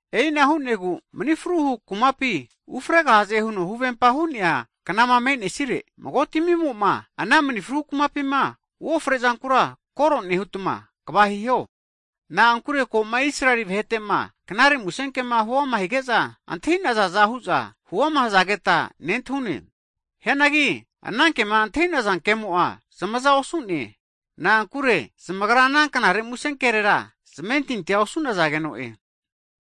E'ina hu'negu manifruhu kumapi ufregahaze huno huvempama hu'nea knama menesire, mago'tamimo'ma ana manifru hu kumapima uofre'zankura, kore nehutma kva hiho. Na'ankure koma Israeli vahe'tema knare musenkema huama hige'za antahi'nazaza hu'za huama hazageta nentahune. Hianagi anankema antahi'naza kemo'a zamaza osu'ne, na'ankure zmagra ana knare musenkerera zamentintia osu'nazageno'e.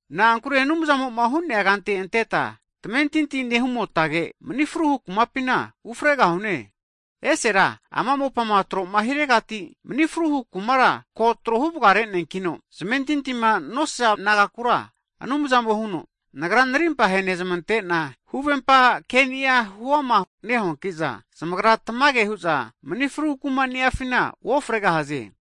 Na'ankure Anumzamo'ma hu'nea kante anteta tamentinti nehumotage manifruhu kumapina ufregahune. Esera ama mopama tro'ma hiregati mni fru hu kumara ko trohu vgareneankino, zmentitima nosaza nagakura Anumzamo huno, Nagra Narimpa henezmate'na huvempa kenia huama nehuanki'za, zamagra tamage hu'za manifru kuma niafina uofregosaze.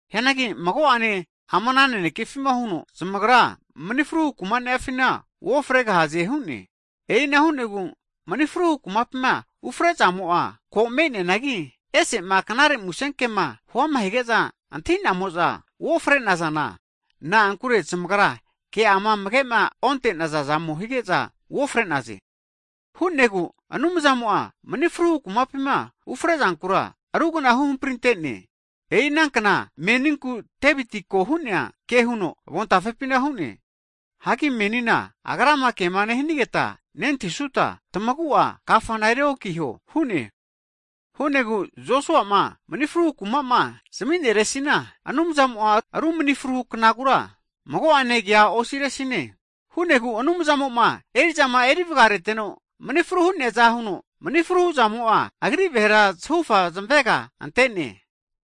Hianagi mago'ane ama nanekefina huno, zamagra manifruhu kumanifina uofregahaze hu'ne. E'ina hu'negu manifru kumapima ufre'zamo'a ko me'neanagi, ese'ma knare musenkema huama hige'za antahi'namo'za uofre'nazana, na'ankure zmagra ke'ama amagema onte'nazazamo hige'za uofre'naze. Hu'negu Anumzamo'a manifruhu kumapima ufrezankura rugna huhamprintene, e'i ana kna meninku Deviti ko hu'nea ke huno avontafepina hu'ne. Hagi menina Nagrama Anumzamona kema nehanigeta nentahisuta, tamagu'a kafana eri onkiho hu'ne. Hu'negu Josua'ma manifru kumama zamineresina, Anumzamo'a ru manifruhu knagura mago'ane kea osiresine. Hu'negu Anumzamo'ma eri'zama erivgareteno mni fru hu'neaza huno, mani fruhuzamo'a, Agri vahera zahufa zmavega ante'ne.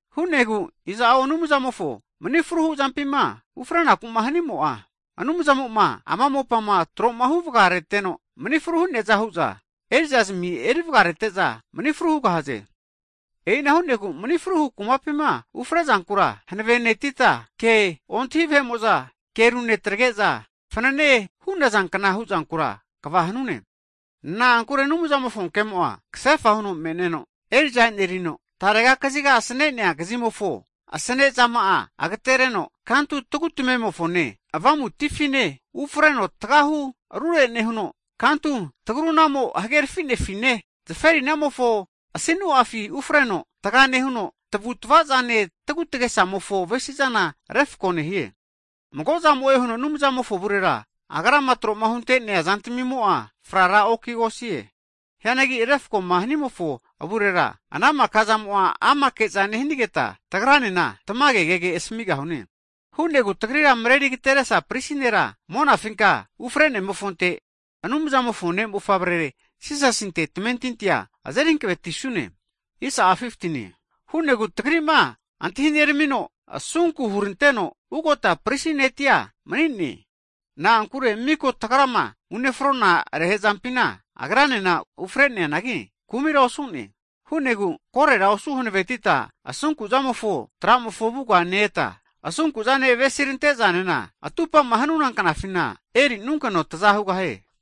Hu'negu iza'o Anumzamofo manifru zampima ufre'nakuma hanimo'a, Aumzamoma ama mopama trohu vga reteno manifru hu'neaza hu'za, erizazmi eri vgarete'za manifru hugahaze. E'ina hu'negu manifruhu kumapima ufre'zankura hankavenetita, ke ontahi vahe'mo'za ke runetrage'za fanane hunazankna huzankura kva hanune. Na'ankure Anumzamofo kemo'a kasefa huno me'neno, eri'za enerino, tarega kaziga asanenea kazimofo asenezama'a agatereno, kantu tagu tamemofone, avamutifine ufreno tagahu rurerure nehuno, kantu tagrunamo hagerafi'nefine, zaferinamofo asinu'afi ufreno tga nehuno, tavutavazane tagutagesamofo avesizana refko nehie. Mago'zamo'e huno Anumzamofo avurera, Agrama tro'ma hunte'nea zantamimo'a fraokigosie. Hianagi refkoma hanimofo avurera, ana maka'zamo'a amateke'za nehanigeta, tagranena tamage kege asamigahune. E'ina hu'negu tagrira mareri ageteresa prisi nera monafinka ufrenemofonte, Anumzamofo Ne' Mofavrere Jisasinte tamentintia azeri hankavetisune. Hu'negu tagrima antahineramino, asunku'ma hurantega ugota prisi ne'tia mani'ne. Na'ankure miko tagrama unefrona rehe'zampina Agranena ufreneanagi, kumira osu'ne. Hu'negu korera osu hanavetita asunku Anumzamofo tramofo avuga ne-eta, asunkuzane avesirantezanena, atupama hanuna knafina erinunkeno taza hugahie.